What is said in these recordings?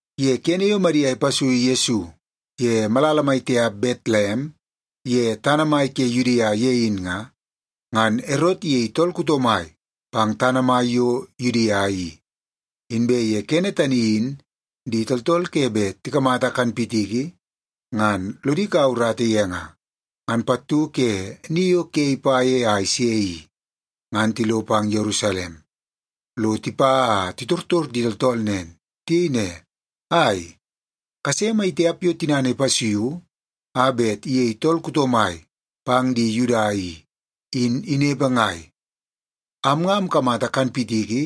Ye kene yo Madia ipasuiu Yesu ye malala mai tiap Betlem ye tana mai ke Yudia ye in nga, ngan Erot iyei tool kuto mai pang tana mai yo Yudia i. Inbe ye kene tani in di tooltool ke bet tikamata kanpitiki ngan lodi kaua urata ye nga, ngan pattu ke ni yo ke ipa ye a ise i, ngan tilo pang Yerusalem lo tipa a titortor di tooltool nen. Tiyei ne, “Ai, kase mai tiap yo tinana ipasuiu a bet iyei tool kuto mai pang di Yuda i, in inepe ngai? Am nga amkamata kanpitiki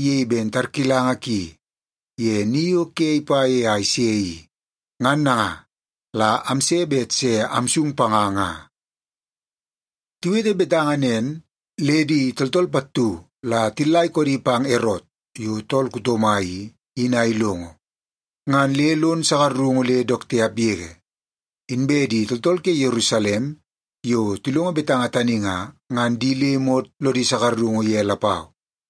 iyei ben tarkilanga ki ye ni yo ke ipa ye a ise i, ngan nanga la amse bet se amsung panga nga.” Tiwete betanga nen, le di tooltool pattu la tillaikoodi pang Erot yo tool kuto mai i, in a ilongo, ngan le lon sakarungu le dook tiap yege. Inbe di tooltool ke Yerusalem yo tilongo betanga tani nga, ngan di le imot lodi sakarungu ye lapau.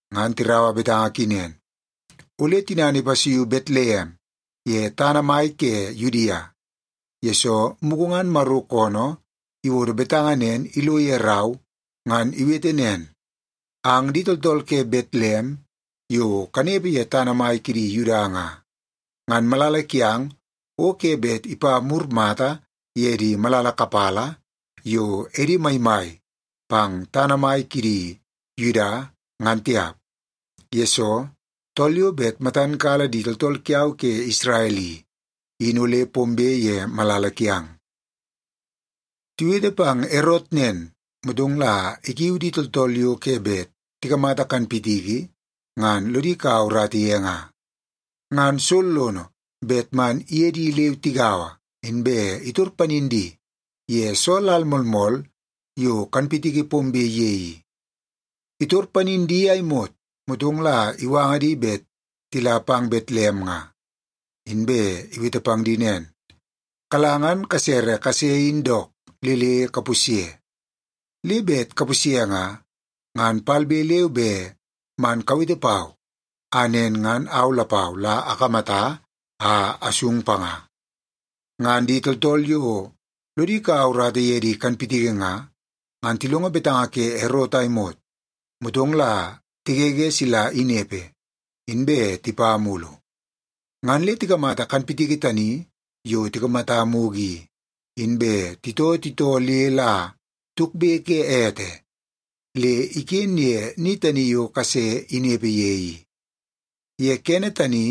Ngan tiraua betanga ki nen, “Ole tinana ipasuiu Betlem ye tana mai ke Yudia, yesoo mugu ngan Maro koonoo iwodo betanga nen ilo ye rau ngan iwete nen, ‘Ang di tooltool ke Betlem yo kanepe ye tana mai kidi Yuda nga, ngan malala kiang o ke bet ipa mur mata ye di malala kapala yo edi maimai pang tana mai kidi Yuda, ngan tiap, yesoo tool yo bet matan kala di tooltool kiau ke Isrel i, in ole pombe ye malala kiang.’” Tiwete pang Erot nen, motong la ikiu di tooltool yo ke bet tikamata kanpitiki ngan lodi kaua urata ye nga, ngan sollono bet man iye di leu tigaua, inbe itor panin di ye soo lal moolmool yo kanpitiki pombe ye i. Itor panin di a imot, motong la iwanga di bet tila pang Betlem nga. Inbe iwete pang di nen, “Kala ngan kasere kase in dook le le kapusye. Le bet kapusye nga, ngan palbe leu be man kawete pau a nen ngan au lapau la akamata, a asung panga.” Ngan di tooltool yo lodi kaua urata ye di kanpitiki nga, ngan tilongo betanga ke Erot a imot, motong la tigege sila inepe, inbe tipa mulu. Ngan le tikamata kanpitiki tani yo tikamata mugu i, inbe titoo titoo le la tukbe ke ete le iken ye ni tani yo kase inepe ye i. Ye kene tani,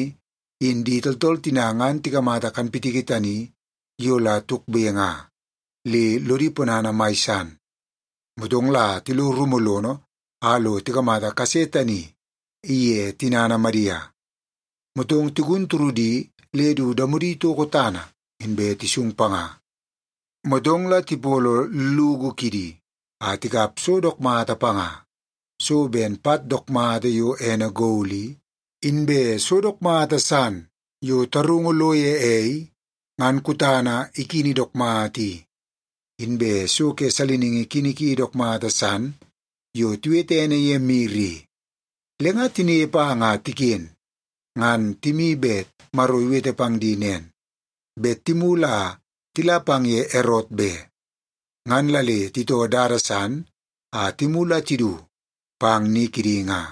in di tooltool tina ngan tikamata kanpitiki tani yo la tukbe nga, le lodi ponana mai san. Motong la tilo rumu lono a lo tikamata kase tani iye tinana Madia, motong tigun turudi le du damodi toko tana, inbe tisung panga. Motong la tipolo llugu kidi a tikap so dook mata panga; so ben pat dook mata yo ene gol i, inbe so dook mata san yo tarungu lo ye ei ngan kutana ikini dook mata i, inbe so ke saliningi kini ki dook mata san yo tiwete ene ye mir i. Le nga tinepe a nga tiken, ngan timi bet Maro iwete pang di nen, bet timulu a tila pang ye Erot be. Ngan la le titoo dada san a timulu a tidu pang ni kidi nga.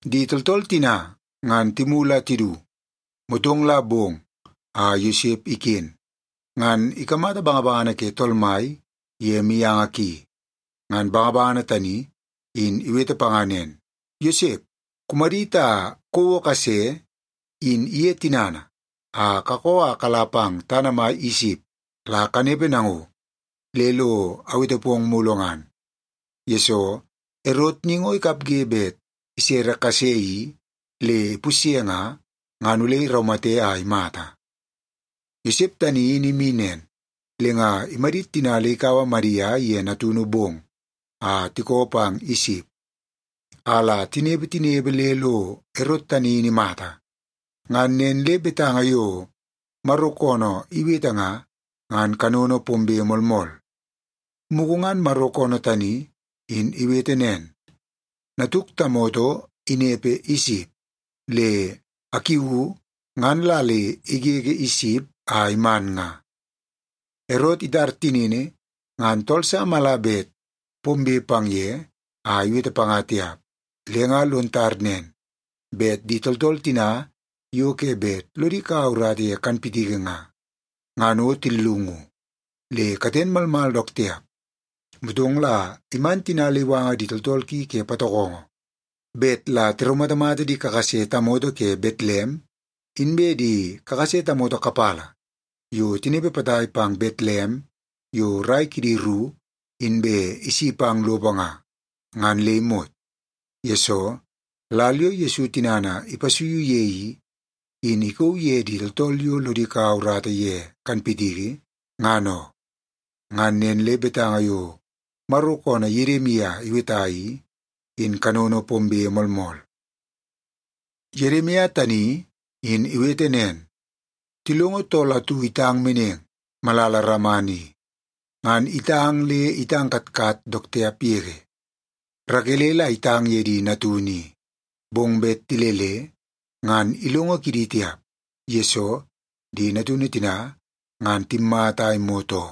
Di tooltool tina ngan timulu a tidu, motong la bong a Yosep iken, ngan ikamata bangabangana ke Tool Mai ye mianga ki. Ngan bangabangana tani in iwete panga nen, “Yosep, kumadit a kouo kase in iye tinana a kakoo a kala pang tana mai Isip la kanepe nango le lo awete pong mulu ngan, yesoo Erot ni ngo ikapge bet isere kase i le ipusye nga, ngan ole iraumate a imata.” Yosep tani in imi nen, le nga imadit tina le ikaua Madia iye natunu bong a tikoo pang Isip, a la tinepe tinepe le lo Erot tani in imata. Ngan nen le betanga yo Maro koonoo iwete nga, ngan kanono pombe moolmool. Mugu ngan Maro koonoo tani in iwete nen, “Natuk tamoto inepe Isip, le akiuu ngan la le igege Isip a iman nga.” Erot itar tinini ngan tool sa mala bet pombe pang ye a iwete panga tiap. Le nga lon tar nen, bet di tooltool tina yo ke bet lodi kaua urata ye kanpitiki nga, ngan o tillungu, le katen malmal dook tiap. Motong la iman tina le iwanga di tooltool ki ke patokongo bet la tiraumatamata di kakase tamoto ke Betlem inbe di kakase tamoto kapala yo tinepe potai pang Betlem yo rai kidi ru inbe isi pang lopo nga, ngan le imot. Yesoo, lal yo Yesu tinana ipasuiu ye i, in ikauu ye di tooltool yo lodi kaua urata ye kanpitiki, ngan oo. Ngan nen le betanga yo Maro koonoo Yedimia iweta i, in kanono pombe moolmool. Yedimia tani in iwete nen, “Tilongo tool atu itang meneng malala Rama ni, ngan itang le itang katkat dook tiap yege. Rakele la itang ye di natunu i, bong bet tilele, ngan ilongo kidi tiap, yesoo di natunu tina ngan timmata a imot oo.”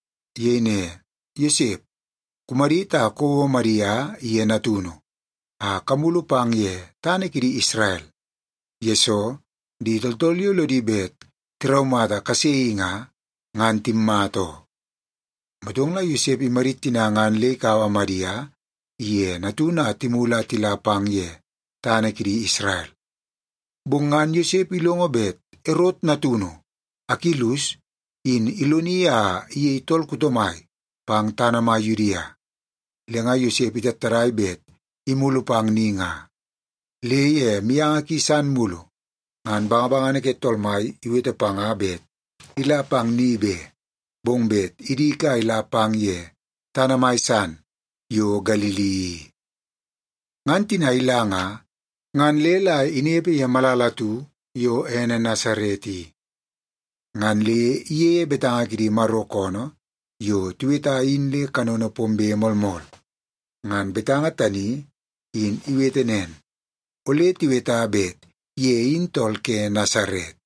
Iyei ne, “Yosep, kumadit a kouo Madia iye natunu a kamulu pang ye tana kidi Isrel, yesoo di tooltool yo lodi bet tiraumata kase i nga, ngan timmata oo.” Motong la Yosep imadit tina ngan le ikaua Madia iye natunu a timulu a tila pang ye tana kidi Isrel. Bong ngan Yosep ilongo bet Erot natunu Akilus in iloni a iyei tool kuto mai pang tana mai Yudia. Le nga Yosep itattadai bet imulu pang ni nga. Le ye mianga ki san mulu, ngan bangabangana ke Tool Mai iwete panga bet ila pang ni be, bong bet idik a ila pang ye tana mai san yo Galili i. Ngan tina ila nga, ngan le la inepe ye malala atu yo ene Nasaret i. Ngan le iyeie betanga kidi Maro koonoo yo tiweta in le kanono pombe moolmool. Ngan betanga tani in iwete nen, “Ole tiweta bet ye in tool ke Nasaret.”